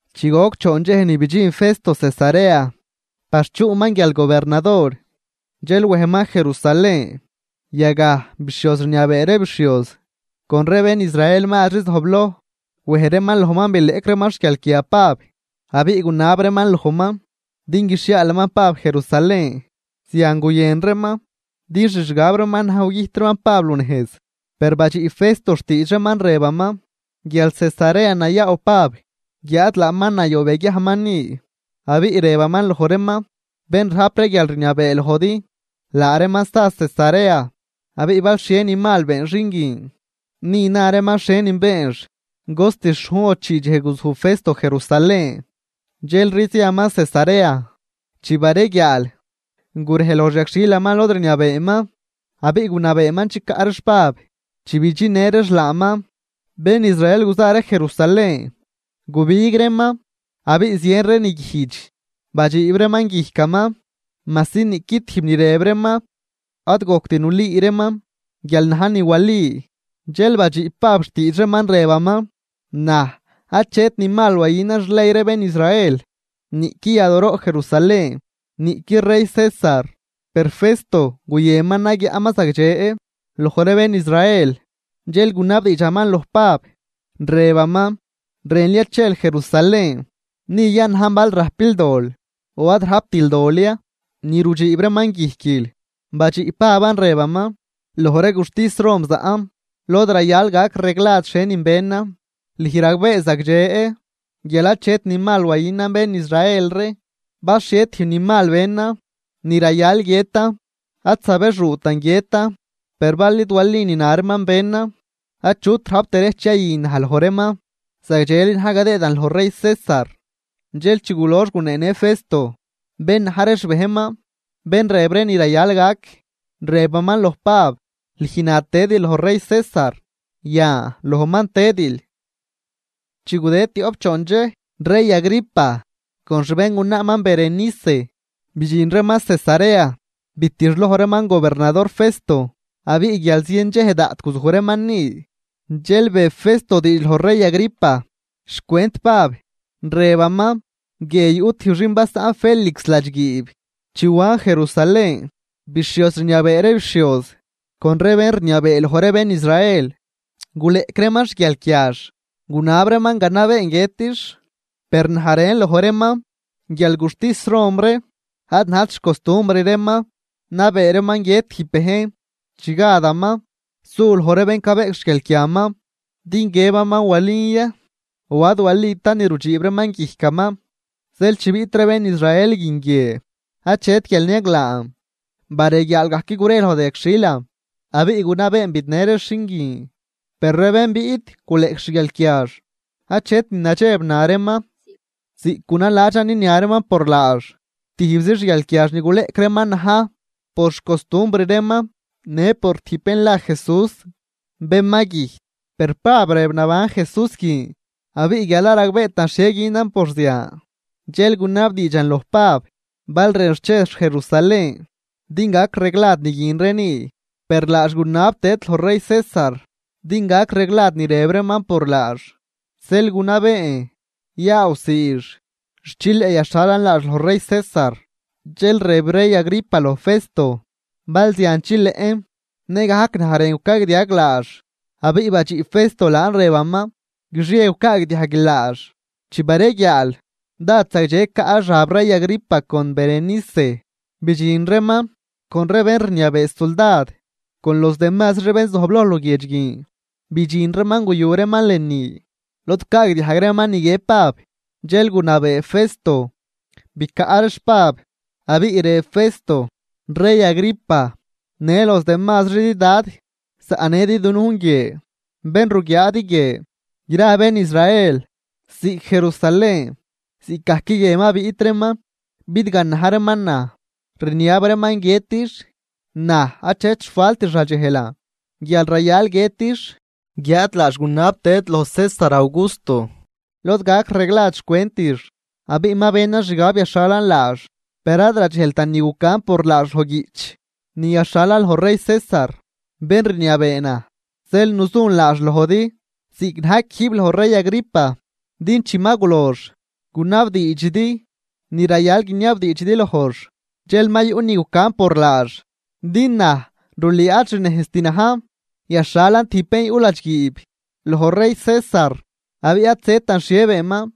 Chi goc choon dxej ni bidxin Festo Cesarea par chuꞌman guial gobernador, dxel wejman Jerusalén. Yagaj, bixhioz rniabee ree bixhioz con ree bén Israel mazri zojbloj, wej reeman lojman bileꞌc reeman xguialquia Pab, abiꞌ gunab reeman lojman din guixhiaalaman Pab Jerusalén. Zian guyën reeman din xixgab reeman na̱j gugüjt reeman Pab runejz. Per badxiꞌ Festo xtiidx reeman rëbaman guial Cesarea nayaaw Pab guiáad laaman nayob yaguiajman ni, abiꞌ rëbaman loj reeman: ―Bén rajp ree guialrniabee lojdi, laa reeman sa Cesarea, abiꞌ bal xhie ni mal been xin guin, ni na reeman xhienin beenx. Cost xhujn o chii dxej guzuj Festo Jerusalén, dxelri ziaman Cesarea. Chi bareguiaal, gurej loj xyagxhilaman lod rniabeeman, abiꞌ gunabeeman chicaꞌ reex Pab. Chi bidxinnë reex laaman, bén Israel guza ree Jerusalén, gubig reeman abiꞌ zien ree niguijdx badxiib reeman guijcaman, majsi niꞌqui tijb ni rëb reeman ad gojct nulüü reeman guial najn ni wali. Dxel badxiꞌ Pab xtiidx reeman, rëbaman: ―Naj, achet ni mal wayünan xley ree bén Israel, niꞌqui yadooroꞌ Jerusalén, niꞌqui rey César. Per Festo guyënman nayaꞌnman zagdxe loj ree bén Israel, dxel gunabdiidxaman loj Pab, rëbaman: ―¿Rënl ya chel Jerusalén? Ni yanajn bal rajpil dol o ad rajptil dol ya ni rudxiib reeman guijquil. Badxiꞌ Paban rëbaman: ―Loj ree guxtis Roman zaꞌn, lod rayal gac reglad xhienin benan. Lüj ragbee zagdxe guial achet ni mal wayünan bén Israel ree. Bal xhie tijb ni mal benan ni rayal guiëtan, ad zabexuutan guiëtan. Per bal id wali ni na reeman benan, achut rajp derejch yayü naj loj reeman. Zagdxeli na̱j gadëëdan loj rey César. Dxel chi gulox guneenë Festo bén na̱j ree xbejnman, bén rëb ree ni rayal gac, rëbaman loj Pab: ―Lüj na tëdil loj rey César, yan lojman tëdil. Chi gudëd tioꞌp choon dxej, rey Agripa con xbéngunaaman Berenice bidxin reeman Cesarea bitixloj reeman gobernador Festo. Abiꞌ guial zien dxej daꞌt guzuj reeman ni, dxel be Festo diidx loj rey Agripa xcwent Pab, rëbaman: ―Guie yuꞌ tijb xin basaꞌn Félix ladxguiib. Chi wan Jerusalén, bixhioz rniabee ree bixhioz con ree bén rniabee loj ree bén Israel guleꞌc reeman xguialquiax, gunab reeman ganabeen guiëtix. Per naj rën loj reeman guial guxtis Rom ree ad najt xcostumbr reeman nabee reeman guiët tijb bejn chi gadaman su loj ree bén cabeꞌc xguialquiaman din guiëbaman walin ya o ad walitan ni rudxiib reeman guijcaman. Zeel chi biꞌt ree bén Israel guin guie, achet guial niaglaan, bareguiaal gajc gure loj da yagxhilan, abiꞌ gunabeen bidnë reex xin guin. Per ree bén biꞌt guleꞌc xguialquiax, achet ni nadxeb na reeman ziꞌc gunaladxan ninia reeman por laax. Tijbzi xguialquiax ni guleꞌc reeman na̱j por xcostumbr reeman në por tijb bén la Jesús, bén ma güjt, per Pab rëb naban Jesús guin. Abiꞌ guial ad ragbeetan xhie günan por zian, dxel gunabdiidxan loj Pab bal rënx chex Jerusalén din gac reglad ni guin ree ni. Per laax gunab tëd loj rey César din gac reglad ni rëb reeman por laax, zeel gunabeen yaawsiix xt chileꞌ yaxhalan laax loj rey César. Dxel rëb rey Agripa loj Festo: ―Bal zian chileꞌn, nëgajc naj rën gucagdiag laax. Abiꞌ badxiꞌ Festo laan rëbaman: ―Guixie gucaagdiajguil laax. Chi bareguiaal, dád zagdxe caꞌ xab rey Agripa con Berenice bidxin reeman con ree bén rniabee suldad con los demazri ree bén zojbloj luguiedx guin, bidxin reeman guyu reeman lënü lod gucaagdiajg reeman ni guiëb Pab. Dxel gunabee Festo bicaꞌ reex Pab. Abiꞌ rëb Festo: ―Rey Agripa në los demazridi dad zaꞌnëdi dunujn guie. Bén ruguiaadi guie, gra bén Israel, ziꞌc Jerusalén ziꞌcgajc guie ma biꞌt reeman bidganaj reeman naj rniab reeman guiëtix. Naj, achet xfaltix radxejlan guial rayal guiëtix. Guiáad laax gunab tëd loj César Augusto lod gac reglad xcwentix, abiꞌ ma benan xgab yaxhalan laax. Per ad radxejltan ni gucan por laax loj guiꞌch ni gaxhalan loj rey César, bén rniabee naj. Zeel nuzun laax lojdi ziꞌc na̱j quijb lojl rey Agripa, din chi ma gulox gunabdiidxidi ni rayal guiniabdiidxidi lojx dxel ma yuꞌ ni gucan por laax. Din naj rulüü ad xnejzt na̱j yaxhalan tijb bén yuꞌ ladxguiib loj rey César abiꞌ ad zëtan xhie beenman.